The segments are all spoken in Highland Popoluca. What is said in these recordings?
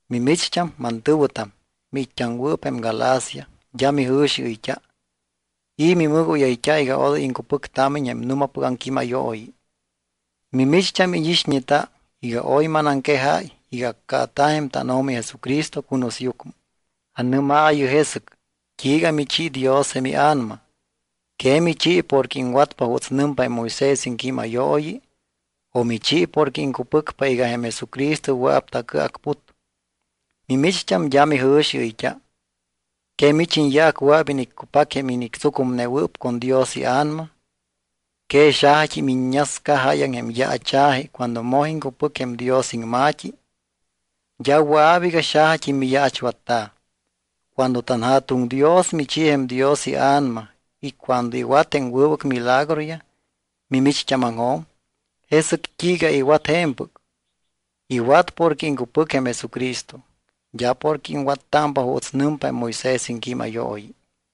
¿Mimicht́am, mantɨ̱wɨtam, miit́t́aŋwɨɨp jém Galacia, d́a mijɨ̱xiɨyt́a? ¿I̱ mimɨgóyayt́a iga odoy iŋcupɨctámiñ jém nu̱mapɨc aŋquímayooyi? Mimicht́am íñixñeta iga oy manaŋquejayt́a iga accaata̱ jém tánO̱mi Jesucristo cunusyucmɨ. Anɨ́maayɨ jesɨc, ¿t́iiga michi Dios jém iA̱nama? ¿Que michi porque iŋwatpa juuts nɨmpa jém Moisés iŋquímayooyi, o michi porque iŋcupɨcpa iga jém Jesucristo wɨa̱p tacɨacput? Mimicht́am d́a mijɨ̱xiɨyt́a. ¿Que mich iñyaac wɨa̱p iniccupac jém inictsucumnewɨɨp con Dios iA̱nama? ¿Que xajat́im iññasca jáyaŋ jém yaacha̱ji cuando moj iŋcupɨc jém Dios iŋma̱t́i? D́a wɨa̱p iga xajat́im miyaachwatta̱. Cuando tanJa̱tuŋ Dios michi jém Dios iA̱nama y cuando iwat jém wɨbɨc milagroyaj mimicht́ámaŋjo̱m, ¿jesɨc t́iiga iwat je̱mpɨc? Iwat porque iŋcupɨc jém Jesucristo, d́a porque iŋwattámpa juuts nɨmpa jém Moisés iŋquímayooyi.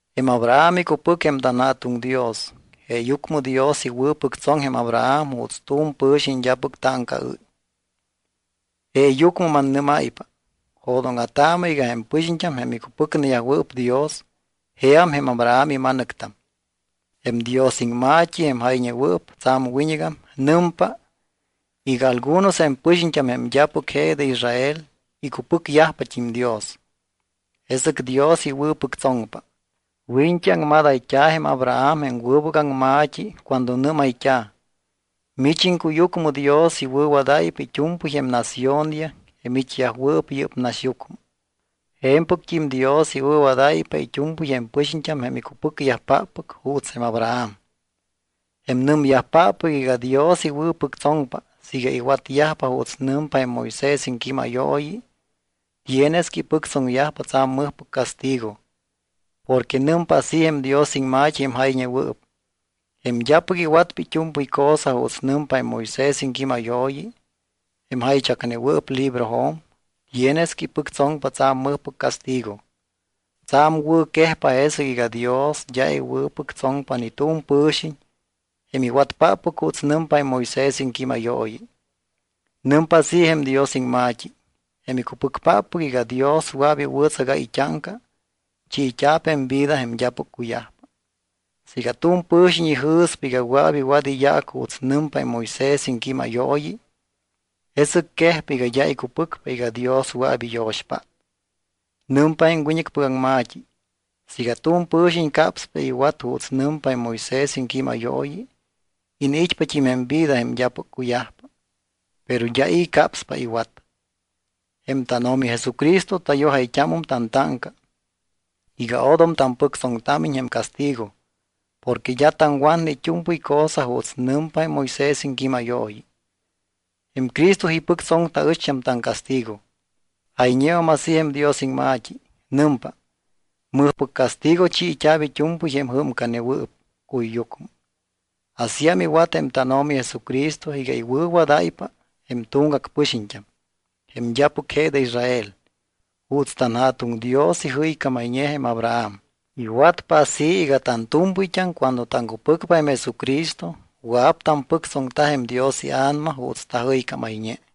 Jém Abraham icupɨc jém tanJa̱tuŋ Dios. Jeeyucmɨ Dios iwɨ̱pɨctsoŋ jém Abraham juuts tu̱m pɨ̱xiñ d́apɨc táŋcaɨ́y. Jeeyucmɨ mannɨ́máypa, jo̱dóŋa̱taamɨ iga jém pɨxiñt́am, jém icupɨcneyajwɨɨp Dios, jeam jém Abraham ima̱nɨctam. Jém Dios iŋma̱t́i, jém jayñewɨɨp tsa̱m wiñɨgam, nɨmpa iga algunos jém pɨxiñt́am jém d́apɨc je de Israel icupɨcyajpat́im Dios, jesɨc Dios iwɨ̱pɨctsoŋpa. Wiñt́i aŋmadayt́a̱ jém Abraham jém wɨbɨc aŋma̱t́i cuando nɨ́mayt́a̱: “Mich iŋcuyucmɨ Dios iwɨ̱wadáypa it́u̱mpɨy jém naciónyaj jém it́yajwɨɨp yɨ́p naxyucmɨ.” Je̱mpɨct́im Dios iwɨ̱wadáypa it́u̱mpɨy jém pɨxiñt́am jém icupɨcyajpáppɨc juuts jém Abraham. Jém nɨmyajpáppɨc iga Dios iwɨ̱pɨctsoŋpa siiga iwatyajpa juuts nɨmpa jém Moisés iŋquímayooyi tienes que ipɨctsoŋyajpa tsa̱m mɨjpɨc castigo porque nɨmpa así jém Dios iŋma̱t́i jém jayñewɨɨp: “Jém d́apɨc iwatpa it́u̱mpɨy cosa juuts nɨmpa jém Moisés iŋquímayooyi, jém jaychacneta̱wɨɨp librojo̱m, tienes que ipɨctsoŋpa tsa̱m mɨjpɨc castigo.” Tsa̱m wɨ̱quejpa jesɨc iga Dios d́a iwɨ̱pɨctsoŋpa ni tu̱m pɨ̱xiñ jém iwatpáppɨc juuts nɨmpa jém Moisés iŋquímayooyi. Nɨmpa así jém Dios iŋma̱t́i: “Jém icupɨcpáppɨc iga Dios wɨa̱p iwɨ̱tsagáy it́áŋca, chiit́a̱p jém vida jém d́apɨc cuyajpa.” Siiga tu̱m pɨ̱xiñ ijɨ̱spa iga wɨa̱p iwat iyaac juuts nɨmpa jém Moisés iŋquímayooyi, jesɨc quejpa iga d́a icupɨcpa iga Dios wɨa̱p iyo̱xpát. Nɨmpa jém wiñɨcpɨc aŋma̱t́i: “Siiga tu̱m pɨ̱xiñ capspa iwat juuts nɨmpa jém Moisés iŋquímayooyi, iniit́pat́im jém vida jém d́apɨc cuyajpa, pero d́a i̱ capspa iwat.” Jém tánO̱mi Jesucristo tayojayt́ámum tantáŋca iga odom tampɨctsoŋtámiñ jém castigo porque d́a taŋwatne it́u̱mpɨy cosa juuts nɨmpa jém Moisés iŋquímayooyi. Jém Cristo ipɨctsoŋ taɨcht́am taŋcastigo. Jayñeum así jém Dios iŋma̱t́i, nɨmpa: “Mɨjpɨc castigo chiit́a̱p it́u̱mpɨy jém jɨ́mcanewɨɨp cuyyucmɨ.” Asíam iwat jém tánO̱mi Jesucristo iga iwɨ̱wadáypa jém tuŋgac pɨxiñt́am, jém d́apɨc je de Israel, juuts tanJa̱tuŋ Dios ijɨycámayñe jém Abraham. Iwatpa así iga tantu̱mpɨyt́am cuando taŋcupɨcpa jém Jesucristo wɨa̱p tampɨctsoŋta jém Dios iA̱nama juuts tajɨycámayñe.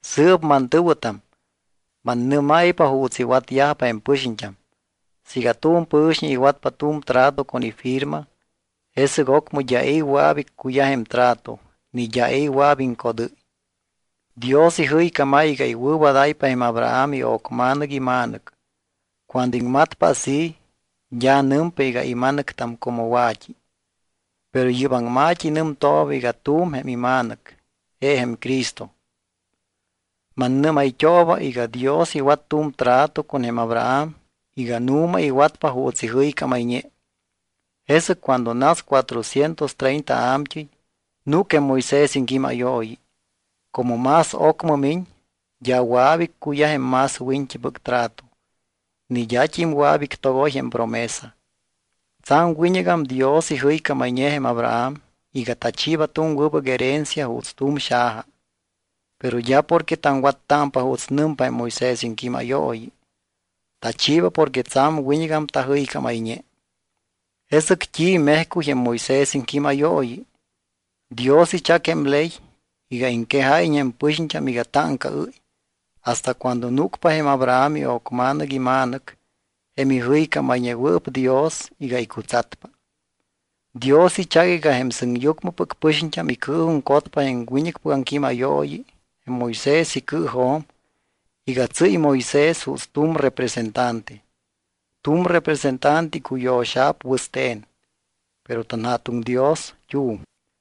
Sɨɨp mantɨ̱wɨtam, mannɨ́máypa juuts iwatyajpa jém pɨxiñt́am. Siiga tu̱m pɨ̱xiñ iwatpa tu̱m trato con ifirma, jesɨc ocmɨ d́a i̱ wɨa̱p iccuyaj jém trato ni d́a i̱ wɨa̱p iŋcodɨ́y. Dios ijɨycámáy iga iwɨ̱wadáypa jém Abraham io̱cma̱nɨc ima̱nɨc. Cuando iŋmatpa así, d́a nɨmpa iga ima̱nɨctam como wa̱t́i, pero yɨ́p aŋma̱t́i nɨmtooba iga tu̱m jém ima̱nɨc, je jém Cristo. Mannɨ́mayt́ooba iga Dios iwat tu̱m trato con jém Abraham iga nu̱ma iwatpa juuts ijɨycámayñe. Jesɨc cuando nas cuatrocientos treinta a̱mt́ɨy, núc jém Moisés iŋquímayooyi. Como más ocmɨ miñ, d́a wɨa̱p iccuyaj jém más wiñɨcpɨc trato, ni d́at́im wɨa̱p ictogoy jém promesa. Tsa̱m wiñɨgam Dios ijɨycámayñe jém Abraham iga tachiiba tu̱m wɨbɨc herencia juuts tu̱m xaja. Pero d́a porque taŋwattámpa juuts nɨmpa jém Moisés iŋquímayooyi. Tachiiba porque tsa̱m wiñɨgam tajɨycámayñe. ¿Jesɨc t́i mejcuy jém Moisés iŋquímayooyi? Dios ichac jém ley iga iŋquejáyiñ jém pɨxiñt́am iga táŋcaɨ́y hasta cuando núcpa jém Abraham io̱cma̱nɨc ima̱nɨc, jém ijɨycámayñewɨɨp Dios iga icutsatpa. Dios ichac iga jém sɨŋyucmɨpɨc pɨxiñt́am icɨɨjuŋcotpa jém wiñɨcpɨc aŋquímayooyi jém Moisés icɨɨjo̱m iga tsɨ́y Moisés juuts tu̱m representante. Tu̱m representante icuyo̱xa̱p wɨste̱n, pero tanJa̱tuŋ Dios t́u̱m.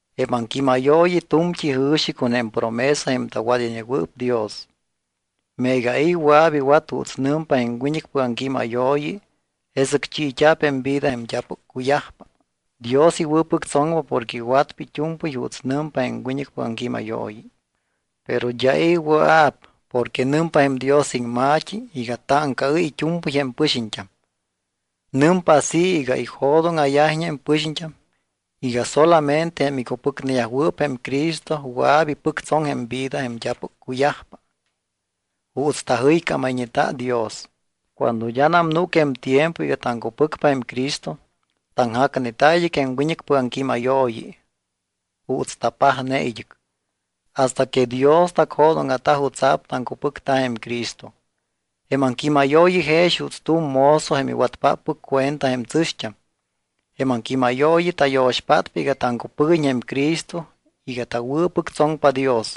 Jém aŋquímayooyi tu̱mt́i jɨ̱xi con jém promesa jém tawadayñewɨɨp Dios. Meega i̱ wɨa̱p iwat juuts nɨmpa jém wiñɨcpɨc aŋquímayooyi, jesɨc chiit́a̱p jém vida jém d́apɨc cuyajpa. Dios iwɨ̱pɨctsoŋpa porque iwatpa it́u̱mpɨy juuts nɨmpa jém wiñɨcpɨc aŋquímayooyi. Pero d́a i̱ wɨa̱p porque nɨmpa jém Dios iŋma̱t́i iga táŋcaɨ́y it́u̱mpɨy jém pɨxiñt́am. Nɨmpa así iga ijo̱dóŋa̱yajiñ jém pɨxiñt́am iga solamente jém icupɨcneyajwɨɨp jém Cristo wɨa̱p ipɨctsoŋ jém vida jém d́apɨc cuyajpa juuts tajɨycámayñeta Dios. Cuando d́anam núc jém tiempo iga taŋcupɨcpa jém Cristo, taŋjacneta id́ɨc jém wiñɨcpɨc aŋquímayooyi, juuts tapajne id́ɨc, hasta que Dios tacjo̱dóŋa̱ta jutsa̱p taŋcupɨcta jém Cristo. Jém aŋquímayooyi jex juuts tu̱m mozo jém iwatpáppɨc cuenta jém tsɨ̱xt́am. Jém aŋquímayooyi tayo̱xpátpa iga taŋcupɨguiñ jém Cristo iga tawɨ̱pɨctsoŋpa Dios.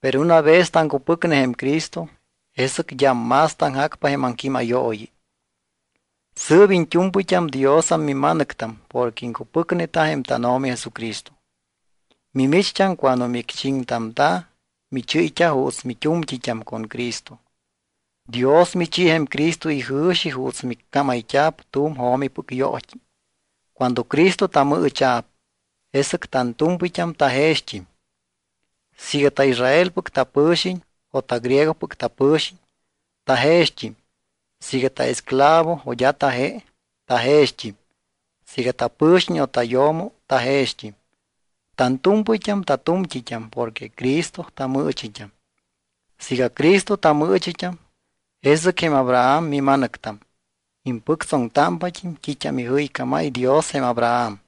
Pero una vez taŋcupɨcne jém Cristo, jesɨc d́am más taŋjacpa jém aŋquímayooyi. Sɨɨp iñt́u̱mpɨyt́am Diosam mima̱nɨctam porque iŋcupɨcneta jém tánO̱mi Jesucristo. Mimicht́am cuando micchiŋtamta̱, michɨ́yt́a juuts mit́u̱mt́it́am con Cristo. Dios michi jém Cristo ijɨ̱xi juuts miccámayt́ámpa tu̱m jo̱mipɨc yoot́i. Cuando Cristo tamɨɨchit́am, jesɨc tantu̱mpɨyt́am tajext́im. Siiga taIsraelpɨc tapɨ̱xiñ o tagriegopɨc tapɨ̱xiñ, tajext́im. Siiga taesclavo o d́a taje, tajext́im. Siiga tapɨ̱xiñ o tayo̱mo tajext́im. Tantu̱mpɨyt́am tatu̱mt́it́am porque Cristo tamɨɨchit́am. Siiga Cristo mimɨɨchit́am, jesɨc jém Abraham mima̱nɨctam. Impɨctsoŋtámpat́im t́it́am ijɨycámáy Dios jém Abraham.